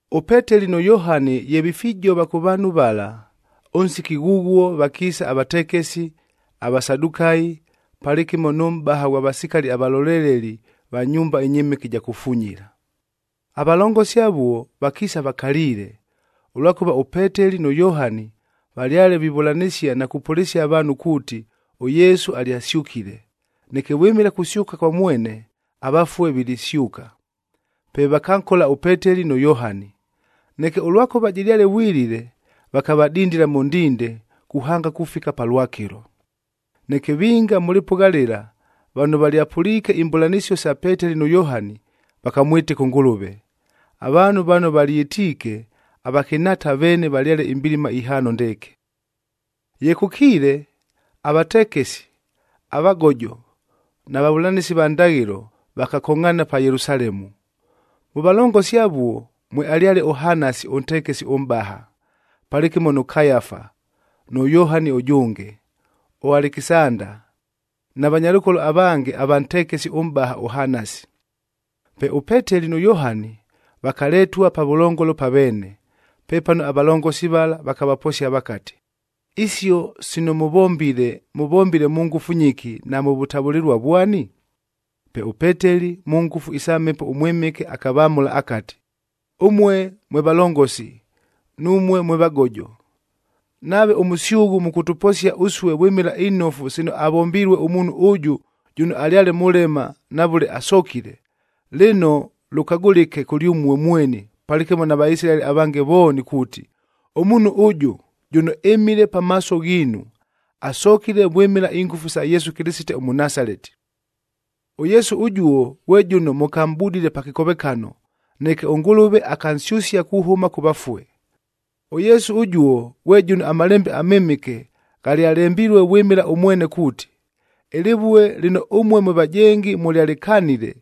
ɄPeteli nʉ Yohani ye vifijova kʉ vaanhu vala, ʉnsiki ghʉghuo vakiisa avatekesi, aVasadukayi,a palɨkɨmo nʉ mʼbaha ghwa vasikali avaloleleli va nyumba ɨnyɨmɨke ɨja kufunyila. Avalongosi avuo vakiisa vakaliile, ʉlwakʉva ʉPeteli nʉ Yohani valyale vivʉlanɨsia na kupʉlɨsia avaanhu kuuti ʉYesu alyasyʉkile, neke vwɨmɨla kusyʉka kwa mwene, avafue vilisyʉka. Pe vakankola ʉPeteli nʉ Yohani. Neke ʉlwakʉva jɨlyale vwilile, vakavadindila mʉ ndinde kuhanga kufika palwakɨlo. Neke vinga mʉ lɨpʉgha lɨla, vano valyapʉliike imbʉlanɨsio sa Peteli nʉ Yohani, vakamwɨtɨka ʉNgʉlʉve. Avaanhu vano valyɨtiike, avakɨnhaata veene valyale imbilima ihaano ndɨɨkɨ. Ye kʉkiile, avatekesi, avagojo na vavʉlanɨsi va ndaghɨlob vakakongʼhaana pa Yelusalemu. Mʉ valongosi avuo, mwealyale ʉHanasi ʉntekesi ʉmʼbaha, palɨkɨmo nʉ Kayafa, nʉ Yohani ʉjʉnge, ʉAlekisanda, na vanyalʉkolo avange ava ntekesi ʉmʼbaha ʉHanasi. Pe ʉPeteli nʉ Yohani, vakaletua pavʉlongolo pa veene. Pepano avalongosi vala vakavaposia vakati, “Isio sino mʉvombile, mʉvombile mʉ ngʉfu nyɨki na mʉ vʉtavʉlɨlua vwani?” Pe ʉPeteli mʉ ngʉfu isa Mhepo ʉMwɨmɨke akavamʉla akati, “Ʉmue mwe valongosi, numue mwe vagojo! Nave ʉmʉsyʉghʉ mʉkʉtʉposia ʉsue vwɨmɨla inofu sino avombilue ʉmuunhu ʉjʉ jʉno alyale mʉlema na vʉle asokile, lɨno lʉkagʉlɨke kʉlyʉmue mweni palɨkɨmo na Vaisilaeli avange vooni kuuti, ʉmuunhu ʉjʉ, jʉno ɨmile pamaaso ghiinu, asokile vwɨmɨla ingʉfu sa Yesu Kɨlɨsite ʉMʉnasaleti. ɄYesu ʉjuo ghwe jʉno mʉkamʼbudile pa kɨkovekano, neke ʉNgʉlʉve akansyʉsia kuhʉma kʉ vafue. ɄYesu ʉjuo ghwe jʉno aMalembe aMɨmɨke ghalyalembilue vwɨmɨla ʉmwene kuuti, ‘Ɨlɨvue lɨno ʉmue mwe vajengi mʉlyalɨkanile,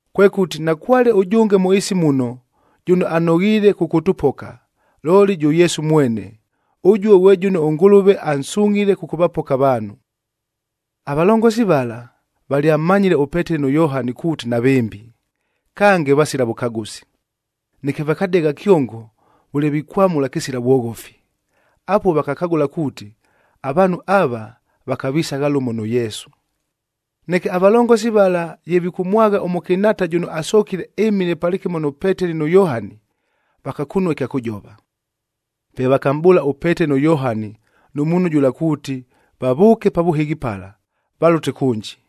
“Kwekʉti nakwale ʉjʉnge mʉ ɨɨsi muno, jʉno anoghiile kʉkʉtʉpoka, looli jʉ Yesu mwene. Ʉjuo ghwe jʉno ʉNgʉlʉve ansungʼhile kʉkʉvapoka avaanhu.” Avalongosi vala valyammanyile ʉPeteli nʉ Yohani kuuti navɨmbi, kange vasila vʉkagʉsi. Neke vakadegha kyongo vʉle vikwamʉla kɨsila vwoghofi. Apuo vakakagʉla kuuti, avaanhu ava vakavisagha lʉmo nʉ Yesu. Neke avalongosi vala ye vikʉmwagha ʉmʉkɨnhaata jʉno asokile ɨmile palɨkɨmo nʉ Peteli nʉ Yohani, vakakunua ɨkya kʉjova. Pe vakamʼbʉʉla ʉPeteli nʉ Yohani nʉ muunhu jʉla kuuti vavʉʉke pa vʉhɨghi pala, valʉte kʉnji.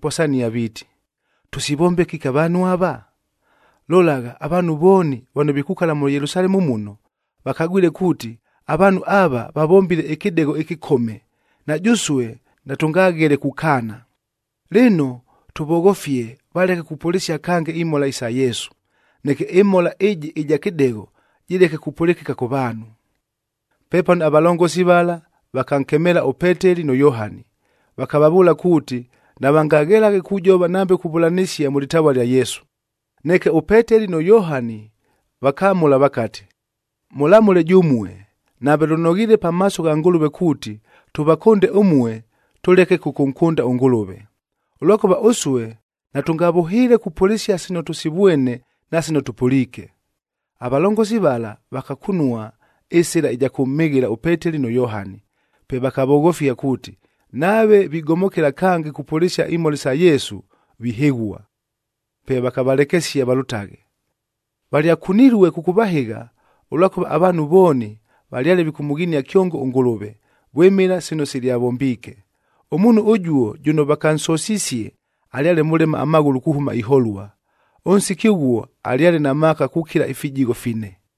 viiti, “Tʉsivombe kɨki avaanhu ava? Lolagha, avaanhu vooni vano vikukala mʉ Yelusalemu muno, vakagwile kuuti, avaanhu ava vavombile ɨkɨdegho ɨkɨkome, na jʉsue natʉngaghele kukaana. Lɨno, tʉvoghofie valeke kupʉlɨsia kange imhola isa Yesu, neke ɨmhola ɨjɨ ɨja kɨdegho, jɨleke kupʉlɨkɨka kʉ vaanhu.” Pepano avalongosi vala vakankemeela ʉPeteli nʉ Yohani, vakavavʉʉla kuuti navangaghelaghe kujova nambe kuvʉlanɨsia mʉ lɨtavua lya Yesu. Neke ʉPeteli nʉ Yohani vakamʉla vakati, “Mʉlamʉle jʉmue, nave lʉnoghiile pamaaso gha Ngʉlʉve kuuti, tʉvakʉnde ʉmue tʉleke kʉkʉnkʉnda ʉNgʉlʉve. Ʉlwakʉva ʉsue natʉngavʉhɨɨle kupʉlɨsia sino tʉsivwene na sino tʉpʉliike.” Avalongosi vala vakakunua ɨsɨla ɨja kʉmhɨghɨla ʉPeteli nʉ Yohani, pe vakavoghofia kuuti, nave vigomokela kange kupʉlɨsia imhola sa Yesu vihɨghua. Pe vakavalekesia valʉtaghe. Valyakunilue kʉkʉvahɨgha, ʉlwakʉva avaanhu vooni valyale vikʉmʉghinia kyongo ʉNgʉlʉve, vwɨmɨla sino silyavombiike. Ʉmuunhu ʉjuo jʉno vakansosisie alyale mʉlema amaghʉlʉ kuhʉma iholua.e Ʉnsiki ʉghuo alyale na maaka kukila ifijigho fine.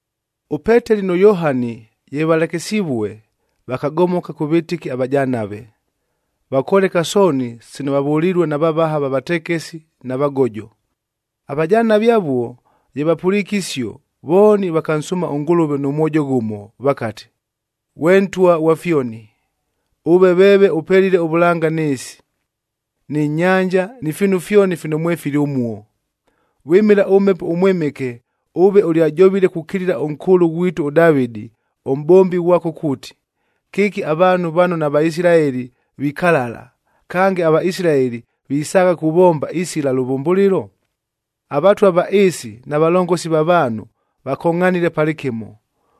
ɄPeteli nʉ Yohani ye valekesivue, vakagomoka kʉ vɨtɨki avajanave, vakoleka sooni sino vavʉlilue na vavaha va vatekesi na vagojo. Avajanave avuo ye vapʉliike isio, vooni vakansʉʉma ʉNgʉlʉve nʉ mwojo ghʉmo vakati, “Ghwe Ntwa ghwa fyoni, ʉve veeve ʉpelile ʉvʉlanga nɨ ɨɨsi, nɨ nyanja, ni fiinu fyoni fino mwefili ʉmuo. Vwɨmɨla ʉMhepo ʉMwɨmɨke ʉve ʉlyajovile kukilila ʉnkʉʉlʉ ghwitu ʉDavɨdi, ʉmʼbombi ghwako kuuti, ‘Kɨki avaanhu vano naVaisilaeli vikalala, kange aVaisilaeli visaagha kuvomba isila lʉvʉmbʉlɨlo? Avatwa va ɨɨsi na valongosi va vaanhu vakongʼhanile palɨkɨmo,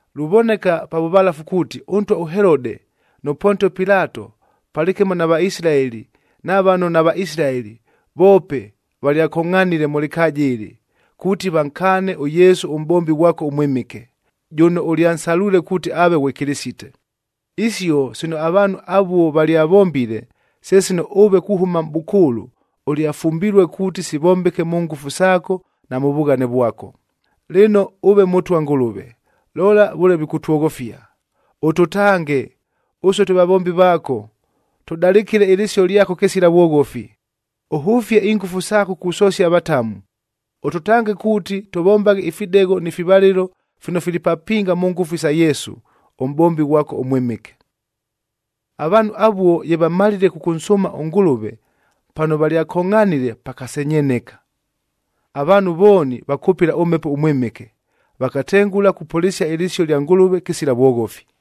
“Luvoneka pa vʉvalafu kuuti ʉntwa ʉHelodeg nʉ Pontio Pilatoh palɨkɨmo na Vaisilaeli na vano naVaisilaeli voope valyakongʼhanile mʉ lɨkaaja ɨlɨ, kuuti vankaane ʉYesu ʉMʼbombi ghwako ʉMwɨmɨke, jʉno ʉlyansalwile kuuti aave ghwe Kɨlɨsite. Isio sino avaanhu avuo valyavombile, se sino ʉve kuhʉma mʼbʉkʉʉlʉ ʉlyafumbilue kuuti sivombeke mʉ ngʉfu saako na mʉ vughane vwako. Lɨno ʉve Mʉtwa Ngʉlʉve, lola vʉle vikʉtwoghofia! Ʉtʉtange, ʉsue twe vavombi vaako, tʉdalɨkɨle ɨlɨsio lyako kɨsila vwoghofi. Ʉhʉfie ingʉfu saako kusosia avatamu, ʉtʉtange kuuti tʉvombaghe ifidegho ni fivalɨlo fino fili papinga mʉ ngʉfu isa Yesu, ʉmʼbombi ghwako ʉMwɨmɨke.” Avaanhu avuo ye vamalile kʉkʉnsʉʉma ʉNgʉlʉve, pano valyakongʼhanile pakasenyeneka. Avaanhu vooni vakʉpɨla ʉMhepo ʉMwɨmɨke, vakatengʉla kupʉlɨsia ɨlɨsio lya Ngʉlʉve kɨsila vwoghofi.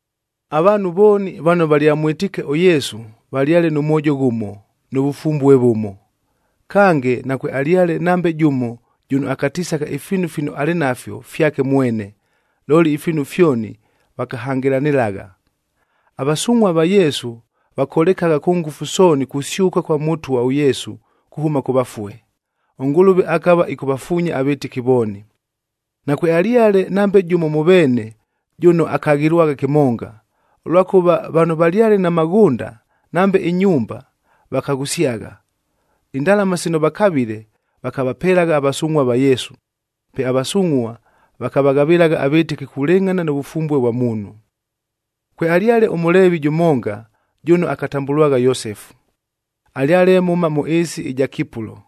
Avaanhu vooni vano valyamwɨtiike ʉYesu valyale nʉ mwojo ghʉmo, nʉ vʉfumbue vʉmo. Kange, nakwealyale nambe jʉmo jʉno akatisagha ifiinu fino alɨ nafyo fyake mwene, looli ifiinu fyoni vakahangɨlanɨlagha. Avasungʼhua va Yesu vakolekagha kʉ ngʉfu sooni kusyʉka kwa Mʉtwa ʉYesu kuhʉma kʉ vafue. ɄNgʉlʉve akava ɨkʉvafuunya avɨtɨki vooni. Nakwealyale nambe jʉmo mʉ veene jʉno akaghɨlwagha kɨmonga, ʉlwakʉva vano valyale na maghʉnda nambe inyumba, vakaghʉsyagha. Indalama sino vakavile, vakavapelagha avasungʼhua va Yesu, pe avasungʼhua vakavaghavɨlagha avɨtɨki kulɨngʼhana nʉ vʉfumbue vwa muunhu. Kwealyale ʉMʉleevi jʉmonga jʉno akatambʉlwagha Yosefu, alyale mhʉma mʉ ɨɨsi ɨja Kipulo.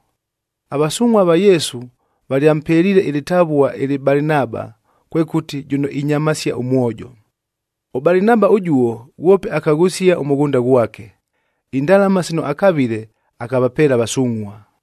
Avasungʼhua va Yesu valyampeliile ɨlɨtavua ɨlɨ Balinaba, kwekʉti, “Jʉno inyamasia ʉmwojo.” ɄBalinaba ʉjuo ghwope akaghʉsia ʉmʉghʉnda ghwake. Indalama sino akavile akavapeela avasungʼhua.